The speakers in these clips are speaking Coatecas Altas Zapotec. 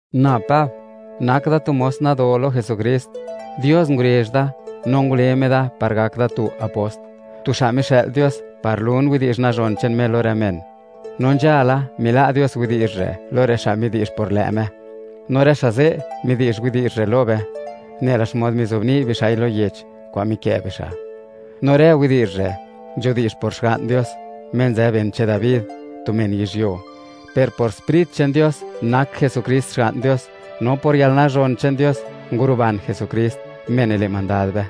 Na Pab, nak da tu mos nado lo Jesukrist. Dios ngurezh da, no ngule Me da par gak da tu apost, tu xa' mixë'l Dios, par lun widi'zh nazhon che'n Me lo rë men. No nzhala, mila' Dios widi'zh re' lo rë xa' midi'zh por lë' Me, no rë xa' ze' midi'zh widi'zh re' lo be, nela xmod mizobni' bixa'i lo yech kwa'n mikë' bixa'. No rë widi'zh re' nidi'zhe Xga'n Dios, Me nzë ben che'n Dabi, tu men yizhyuo, per por Sprit che'n Dios, nak Jesukrist Xga'n Dios, no por yalnazhon che'n Dios, nguruban Jesukrist, Me nile' mandad be.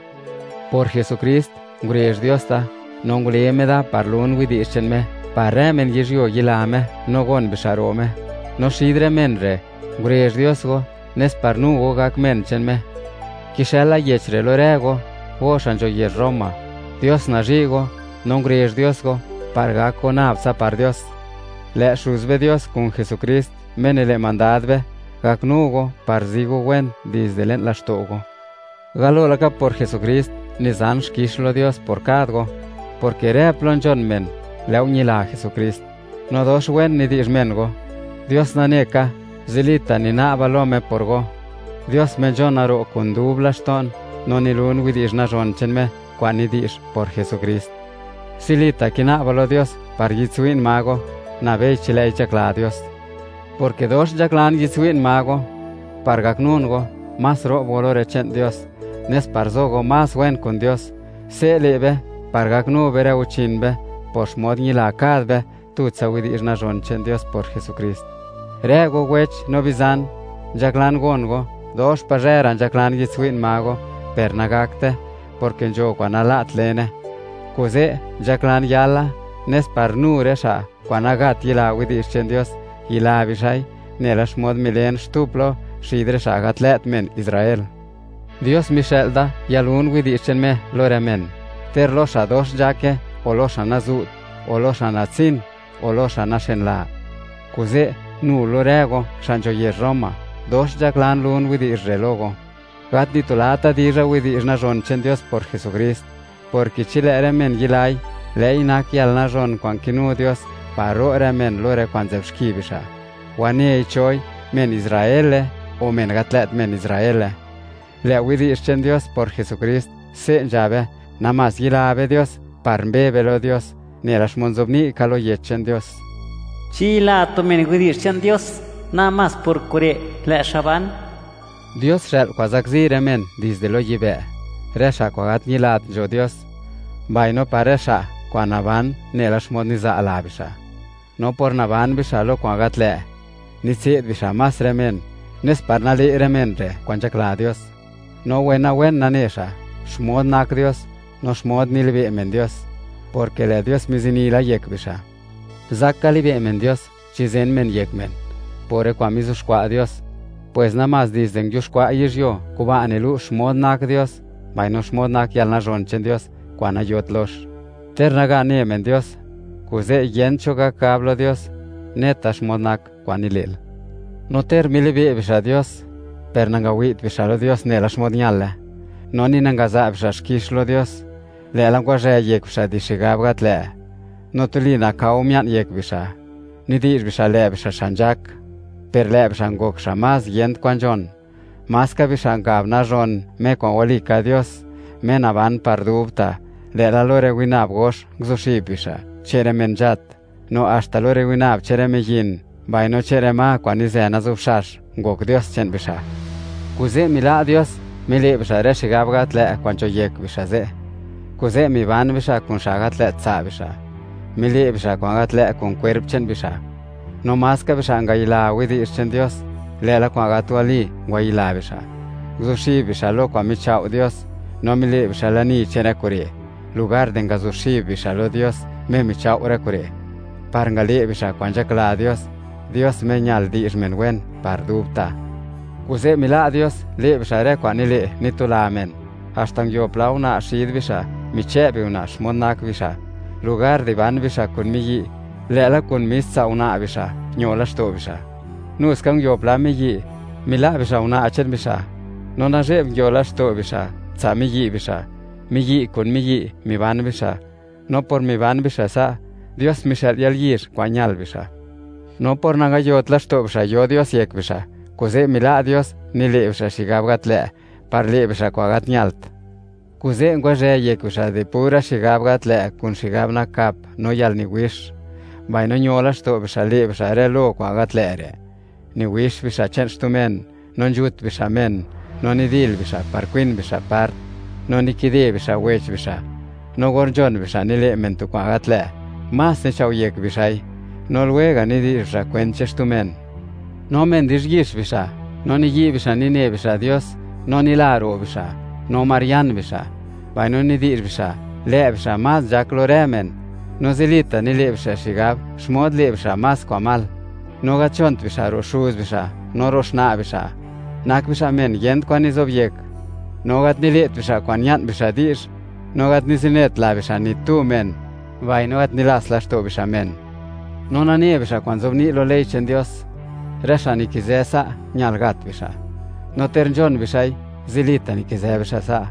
Por Jesukrist, mile' Dios dox wen kuda or ngule Me da par lun widi'zh che'n Me, par rë men yizhyuo yila Me no gon bixa' ro' Me. No xid rë men re', ngurezh Dios go, nes par nu go gak men che'n Me. Kixëla yech re' lo rë go, go xa' nzho yezh Roma. Dios nazhi' go, no ngurezh Dios go par gak go nab tsa par Dios. Lë' Xuz be Dios, kun Jesukrist, Me nile' mandad be, gaknu go par zi go wen dizde le'n laxto' go. Galo laka por Jesukrist, nizan xkix lo Dios por kad go, porke rë plo nzhon men lë' go ñila Jesukrist, no dox wen nidi'zh men go. Dios nane ka, zilita' nina'ba lo Me por go, Dios Me nzhona ro' kun dub laxto'n, no nilun widi'zh nazhon che'n Me kwa'n nidi'zh por Jesukrist. Zilita' kina'ba lo Dios par yi'dtswi'n ma go, nabei chi lë'i nzhakla Dios, porke dox nzhaklan yi'dtswi'n ma go, par gaknun go, más ro'b go lo rë che'n Dios, nes par zo go más wen kun Dios; se' le' be par gaknu be rë guchin be, por xmod ñila kad be tutsa widi'zh nazhon che'n Dios por Jesukrist. Rë go wech no bizan, nzhaklan gon go, dox pazhë ra' nzhaklan yi'dtswi'n ma go, per nagakte, porke nzho kwa'n nala't lene. Kuze' nzhaklan yala, nes par nu rë xa' kwa'n nagat yila widi'zh che'n Dios, yila bixa'i, nela xmod milen xtu plo xid rë xa' gat lë't men Israel. Dios mixë'l da yalun widi'zh che'n Me lo rë men, ter lo xa' dox nzhake, o lo xa' nazu't; o lo xa' natsin, o lo xa' naxenla. Kuze', nu lo rë go, xa' nzho yezh Roma; dox nzhaklan lun widi'zh re' lo go. Gat nitulata' dizha widi'zh nazhon che'n Dios por Jesukrist, porke chi lë' rë men yilai, lë'i nak yalnazhon kwa'n kinu Dios, par ro' rë men lo rë kwa'n nzë'b xki bixa', wanei choi, men Israele o men gat lë't men Israele. Lë' widi'zh che'n Dios por Jesukrist, se' nzhabe, namás yila be Dios par mbe be lo Dios, nela xmod nzobni' ka lo Yech che'n Dios: “Chi yila tu men widi'zh che'n Dios, namás por kure' lë' xa' ban.” Dios xë'l kwa'n zakzi rë men dizde lo yibë', rë xa' kwa'n gat ñilat nzho Dios, mbaino par rë xa' kwa'n naban nela xmod niza' la bixa'. No por naban bixa' lo kwa'n gat lë', nitse'd bixa' más rë men, nes par nale' rë men re' kwa'n nzhakla Dios. No wenawen nane xa' xmod nak Dios, no xmod nilibe' men Dios, porke lë' Dios mizini la yek bixa'. Zak ka libe' men Dios chi zen men yek men por rë kwa'n mizuxkwa' Dios, pues namás dizde nguiuxkwa' yizhyuo, kuba' nilu' xmod nak Dios mbaino xmod nak yalnazhon che'n Dios kwa'n nayot lox, ter naga ne men Dios. Kuze' yent cho gak gab lo Dios: “Neta xmod nak kwan nile'l.” No ter milibe' bixa' Dios, per nangawi't bixa' lo Dios nela xmod ñale, no ni nangaza' bixa' xkix lo Dios, lë'la ngwazhë yek bixa' di xigab gat lë', no tuli nakao mia'n yek bixa'. Nidi'zh bixa' lë' bixa' xa' nzhak, per lë' bixa' ngok xa' más yent kwan nzhon. Maska bixa' ngab nazhon Me kwa'n walika Dios, Me naban par dubta', lë'la lo rë winab nguzuxib bixa', che'n rë men nzhat, no haxta lo rë winab che'n rë miyin, mbaino che'n rë ma kwa'n nizë nazubxax, ngok dios che'n bixa'. Kuze' mila' Dios, mile' bixa' rë xigab gat lë't kwa'n nzho yek bixa' ze'; kuze' miban bixa' kun xa' gat lë't tsa' bixa', mile' bixa' kwa'n gat lë' kun kwerp che'n bixa'. No maska bixa' ngayila widi'zh che'n Dios, lë'la kwa'n gat wali ngwayila bixa'; nguzuxib bixa' lo kwa'n michao' Dios, no mile' bixa' lani che'n rë kure' lugardi ngazuxib bixa' lo Dios Me michao' rë kure', par ngale' bixa' kwa'n nzhakla Dios, Dios Me ñal di'zh men wen par dubta'. Kuze' mila' Dios le' bixa' rë kwa'n nile', nitula men. Haxta nguio pla una' xid bixa' michë' biuna' xmod nak bixa', lugar di ban bixa' kun miyi', lë'la kun mis tsa' una' bixa' ño laxto' bixa'. Nuska nguio pla miyi', mila' bixa' una' che'n bixa', no nazhe'b nguio laxto' bixa' tsa' miyi' bixa'. Miyi' kun miyi' miban bixa', no por miban bixa' sa', Dios mixë'l yalyizh kwa'n ñal bixa'. No por nangayot laxto' bixa' yo Dios yek bixa', kuze' mila' Dios, nile' bixa' xigab gat lë', par le' bixa' kwa'n gat ñalt. Kuze' ngwazhë yek bixa' di pura xigab gat lë' kun xigab nakap no yalniwix, mbaino ño laxto' bixa' le' bixa' rë lo kwa'n gat lë' re': niwix bixa' che'n xtu men, no nzhut bixa' men, no nidil bixa' par kwin bixa' part, no nikide bixa' wech bixa', no or nzhon bixa' nile' men tu kwa'n gat lë', más nichao' yek bixa'i, no lwega' nidi'zh bixa' kwent che'n xtu men. No men di'zhyix bixa', no niyi' bixa' nine bixa' Dios, no nila ro' bixa', no marian bixa', mbaino nidi'zh bixa' lë' bixa' más nzhak lo rë men; no zilita' nile' bixa' xigab xmod le' bixa' más kwa'n mal, no gat nzhont bixa' ro' xuz bixa' ni ro' xna' bixa'. Nak bixa' men yent kwan nizobyek, no gat nile't bixa' kwa'n ña'n bixa' di'zh, no gat nizinet la bixa' ni tu men mbaino gat nilast laxto' bixa' men. No nane bixa' kwan nzobni' lo ley che'n Dios, rë xa' nikizë sa', ñal gat bixa'; no ter nzhon bixa'i, zilita' nikizë bixa' sa',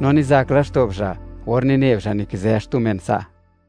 no nizak laxto' bixa' or nine bixa' nikizë xtu men sa'.